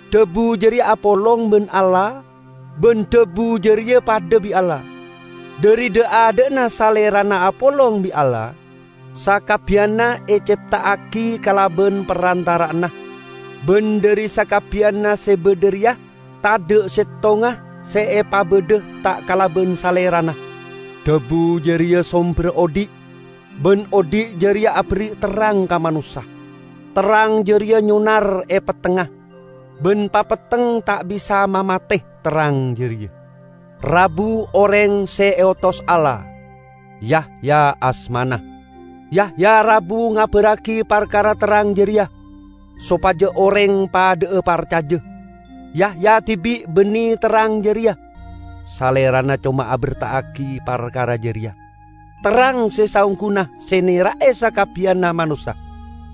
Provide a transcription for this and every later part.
Dhabu jareya apolong ban Allah ban Dhabu jareya padha bi' Allah. Dhari dha'-adha'na Salerana apolong bi' Allah. Sakabbiyanna ecepta'agi kalaban parantara'anna, ban dhari sakabbiyanna se badha reya, tadha' settonga se epabadha ta' kalaban Salerana. Dhabu jareya somberra odhi', ban odhi' jareya aberri' terrang ka manossa. Terrang jareya nyonar e pettengnga, ban papetteng ta' bisa mamate terrang jareya. Rabu oreng se eotos Allah, Yahya asmana. Yahya rabu ngabarragi parkara terrang jareya, sopaja oreng padha'a parcaja. Yahya dibi' banne terrang jareya, salerana coma aberta'agi parkara jareya. Terrang se saongguna se nera'e sakabbiyanna manossa,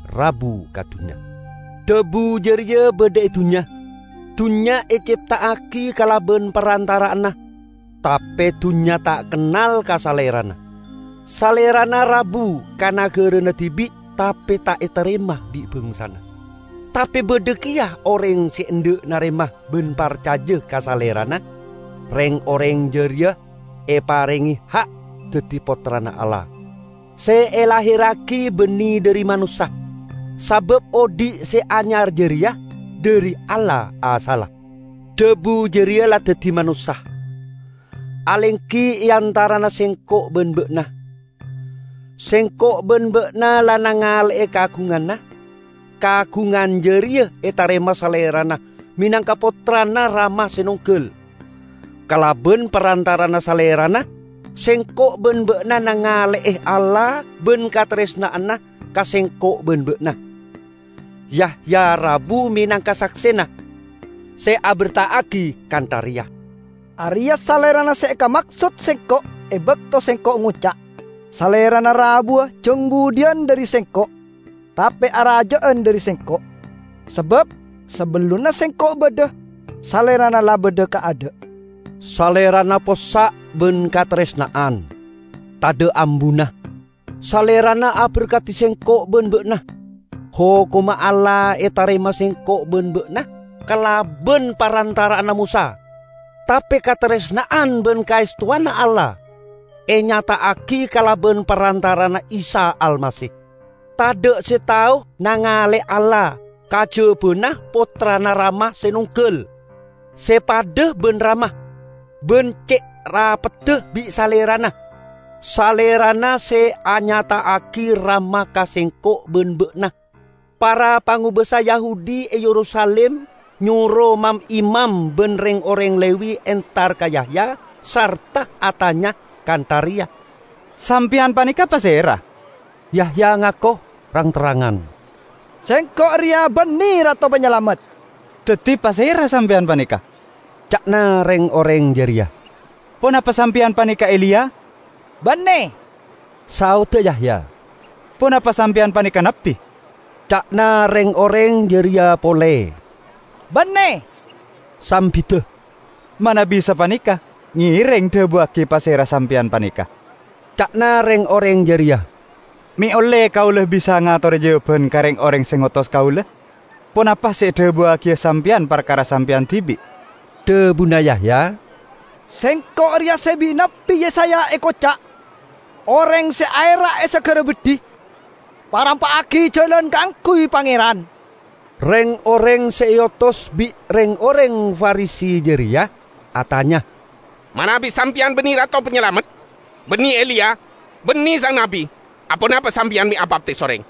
rabu ka dunnya. Dhabu jareya badha e dunnya, dunnya ecepta'agi kalaban parantara'anna, tape dunnya ta' kennal ka Salerana. Salerana rabu ka nagarana dibi' tape ta' etarema bi' bangsana. Tape badha keya oreng se endha' narema ban parcaja ka Salerana; reng-oreng jareya eparenge ha' daddi pottrana Allah. Se elahirragi banne dhari manossa, sabab odhi' se anyar jareya dhari Allah asalla. Dhabu jareya la daddi manossa, alenggi e antarana sengko' ban ba'na. Sengko' ban ba'na la nangale'e kaagunganna. Kaagungan jareya etarema Salerana menangka Pottrana Rama se nonggal. Kalaban parantara'anna Salerana sengko' ban ba'na nangale'e Allah ban kataresna'anna ka sengko' ban ba'na. Yahya rabu menangka saksena, se aberta'agi kantha reya: "Areya' Salerana se ekamaksod sengko' e bakto sengko' ngoca', 'Salerana rabuwa jang budhiyan dhari sengko', tape araja'an dhari sengko', sabab sabellunna sengko' badha Salerana la badha kaadha'.' " Salerana possa' ban kataresna'an; tadha' ambuna, Salerana aberkadi sengko' ban ba'na. Hokomma Allah etarema sengko' ban ba'na kalaban parantara'anna Mosa. Tape kataresna'an ban kaestowanna Allah enyata'agi kalaban parantara'anna Isa Almasih. Tadha' se tao nangale'e Allah, kajabana Pottrana Rama se nonggal, se padha ban Rama, ban ce' rapedda bi' Salerana. Salerana se anyata'agi Rama ka sengko' ban ba'na. Para pangobasa Yahudi e Yerusalim nyoro mam-imam ban reng-oreng Lewi entar ka Yahya sarta atanya kantha reya, "Sampeyan paneka pasera?" Yahya ngako rang-terrangan, "Sengko' reya banne Rato Panyalamet." "Daddi pasera sampeyan paneka?" ca'na reng-oreng jareya. "Ponapa sampeyan paneka Eliya?" "Banne," saodda Yahya. "Ponapa sampeyan paneka Nabbi?" ca'na reng-oreng jareya pole. "Banne," sambidda. "Manabi sapaneka, ngereng dhabuwagi pasera sampeyan paneka," ca'na reng-oreng jareya, "me' olle kaula bisa ngatore jawaban ka reng-oreng se ngotos kaula. Ponapa se edhabuwagiya sampeyan parkara sampeyan dibi'?" Dhabuna Yahya, "Sengko' reya se bi' Nabbi Yesaya ekoca': 'Oreng se aera' e sagara beddhi: Parampa'agi jalan kaangguy Pangeran.' " Reng-oreng se eotos bi' reng-oreng Farisi jareya atanya, "Manabi sampeyan banne Rato Panyalamet, banne Eliya, banne sang Nabbi, aponapa sampeyan me' abaptis oreng?"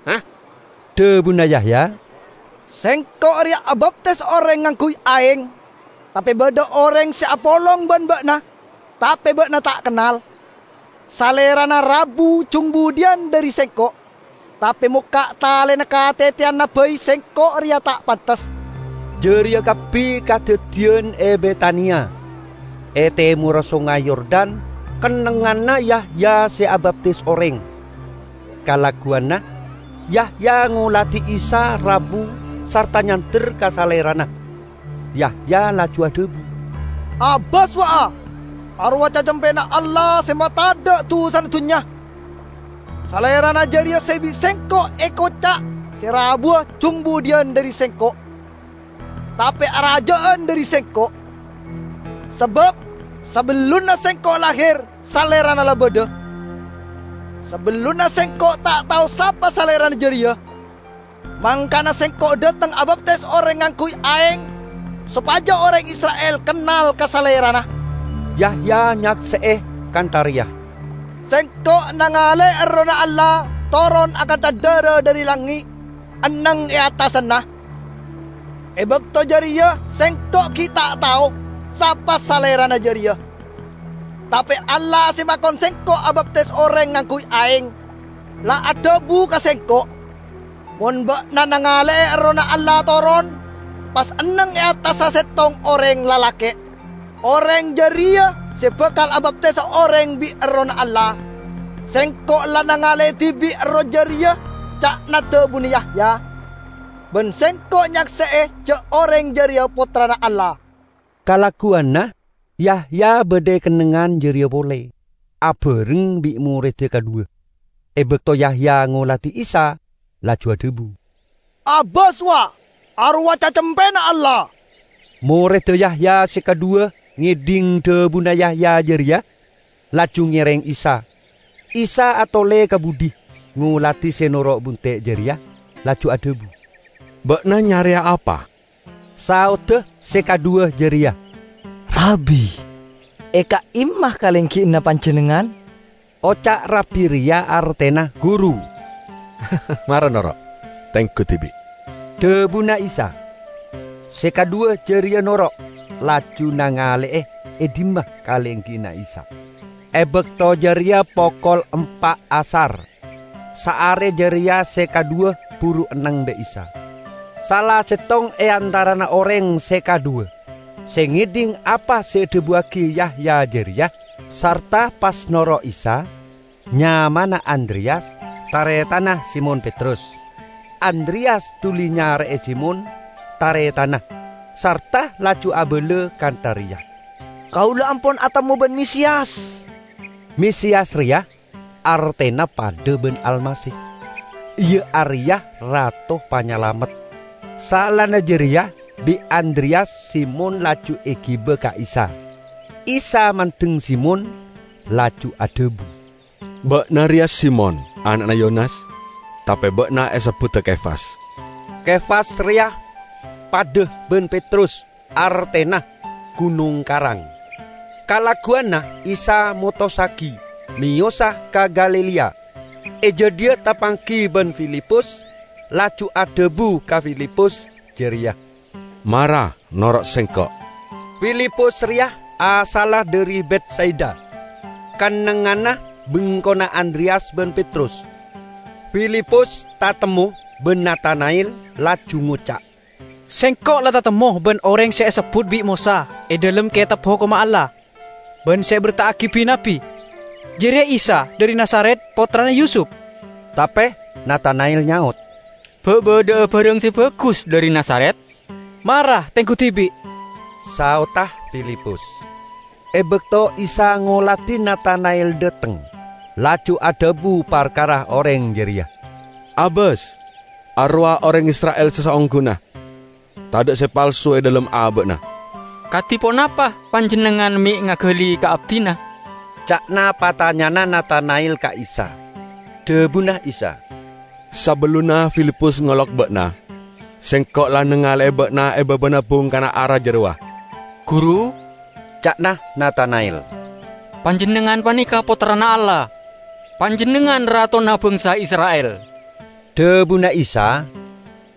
Dhabuna Yahya, "Sengko' reya abaptis oreng ngangguy aeng. Tape badha oreng se apolong ban ba'na tape ba'na ta' kennal. Salerana rabu jang budhiyan dhari sengko', tape mokka' talena kateteyanna bai sengko' reya ta' pantes." Jareya kabbi kadaddiyan e Betania, e temorra Songay Yordan kennengnganna Yahya se abaptis oreng. Kalagguwanna, Yahya ngoladi Isa rabu sarta nyander ka Salerana. Yahya laju adhabu, "Abas, wa, arowa' Cacempena Allah se matadha' dusana dunnya. Salerana jareya se bi' sengko' ekoca' se rabuwa jang budhiyan dhari sengko', tape araja'an dhari sengko', sabab sabellunna sengko' lahir, Salerana la badha. Sabellunna, sengko' ta' tao sapa Salerana jareya. Mangkana sengko' dhateng abaptis oreng ngangguy aeng sopaja oreng Isra'il kennal ka Salerana." Yahya nyakse'e kantha reya: "Sengko' nangale'e Errohna Allah toron akantha dara dhari langnge' enneng e attasanna. E bakto jareya sengko' gi' ta' tao sapa Salerana jareya, tape Allah se makon sengko' abaptis oreng ngangguy aeng, la adhabu ka sengko', 'Mon ba'na nangale'e Errohna Allah toron, pas enneng e attassa settong oreng lalake', oreng jareya se bakal abaptisa oreng bi' Errohna Allah.' Sengko' la nangale'e dibi' Erroh jareya," ca'na dhabuna Yahya, "ban sengko' nyakse'e ja' oreng jareya Pottrana Allah." Kalagguwanna Yahya badha e kennengngan jareya pole abareng bi' moredda kadhuwa. E bakto Yahya ngoladi Isa, laju adhabu, "Abas, wa! Arowa' Cacempena Allah." Moredda Yahya se kadhuwa ngedhing dhabuna Yahya jareya, laju ngereng Isa. Isa atole ka budhi, ngoladi se noro' bunte' jareya, laju adhabu, "Ba'na nyareya apa?" Saodda se kadhuwa jareya, "Rabbi, e ka'imma kalenggiyanna panjennengngan?" (Oca' 'Rabbi' reya artena 'Guru'.) "Mara noro', tenggu dibi'," dhabuna Isa. Se kadhuwa jareya noro', laju nangale'e e dhimma kalenggiyanna Isa. E bakto jareya pokol empa' asar. Saare jareya se kadhuwa buru enneng bi' Isa. Sala settong e antarana oreng se kadhuwa se ngedhing apa se edhabuwagi Yahya jareya sarta pas noro' Isa, nyamana Andreyas, taretanna Simon Petrus. Andreyas duli nyare'e Simon, taretanna, sarta laju abala kantha reya, "Kaula ampon atemmo ban Mesiyas!" (Mesiyas reya artena padha ban Almasih, iya areya Rato Panyalamet.) Saellana jareya bi' Andreyas Simon laju egiba ka Isa. Isa mandeng Simon, laju adhabu, "Ba'na reya Simon, ana'na Yonas, tape ba'na esebbuda Kefas." (Kefas reya padha ban Petrus, artena: gunong karang.) Kalagguwanna Isa motossagi meyosa ka Galilea. E jadhiya tapanggi ban Filipus, laju adhabu ka Filipus jareya, "Mara, noro' sengko'!" Filipus reya asalla dhari Betsaida, kennengnganna bengkona Andreyas ban Petrus. Filipus tatemmo ban Natana'el, laju ngoca', "Sengko' la tatemmo ban oreng se esebbut bi' Mosa e dhalem Ketab Hokomma Allah, ban se eberta'agi bi-nabbi. Jareya Isa dhari Nazaret, pottrana Yusup." Tape Natana'el nyaot, "Ba' badha'a barang se bagus dhari Nazaret?" "Mara tenggu dibi'," saodda Filipus. E bakto Isa ngoladi Natana'el dhateng, laju adhabu parkara oreng jareya, "Abas, arowa' oreng Isra'il se saongguna. Tadha' se palsu e dhalem aba'na." "Kadi ponapa Panjennengngan me' ngagali ka abdina?" ca'na patanyana Natana'el ka Isa. Dhabuna Isa, "Sabellunna Filipus ngolok ba'na, Sengko' la nangale'e ba'na e babana bungkana ara jarowa." "Guru," ca'na Natana'el, "Panjennengngan paneka Pottrana Allah! Panjennengngan Ratona Bangsa Isra'il!" Dhabuna Isa,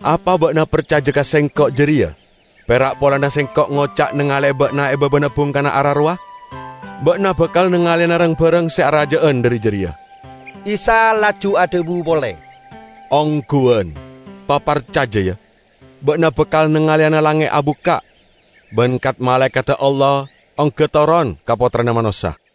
"Apa ba'na parcaja ka Sengko' jareya pera' polana Sengko' ngoca' nangale'e ba'na e babana bungkana ara rowa? Ba'na bakal nangaleyana rang-barang se araja'an dhari jareya!" Isa laju adhabu pole, "Ongguwan, paparcaja, ya, ba'na bakal nangaleyana langnge' abukka', ban kat-malaekadda Allah ongga toron ka Pottrana Manossa."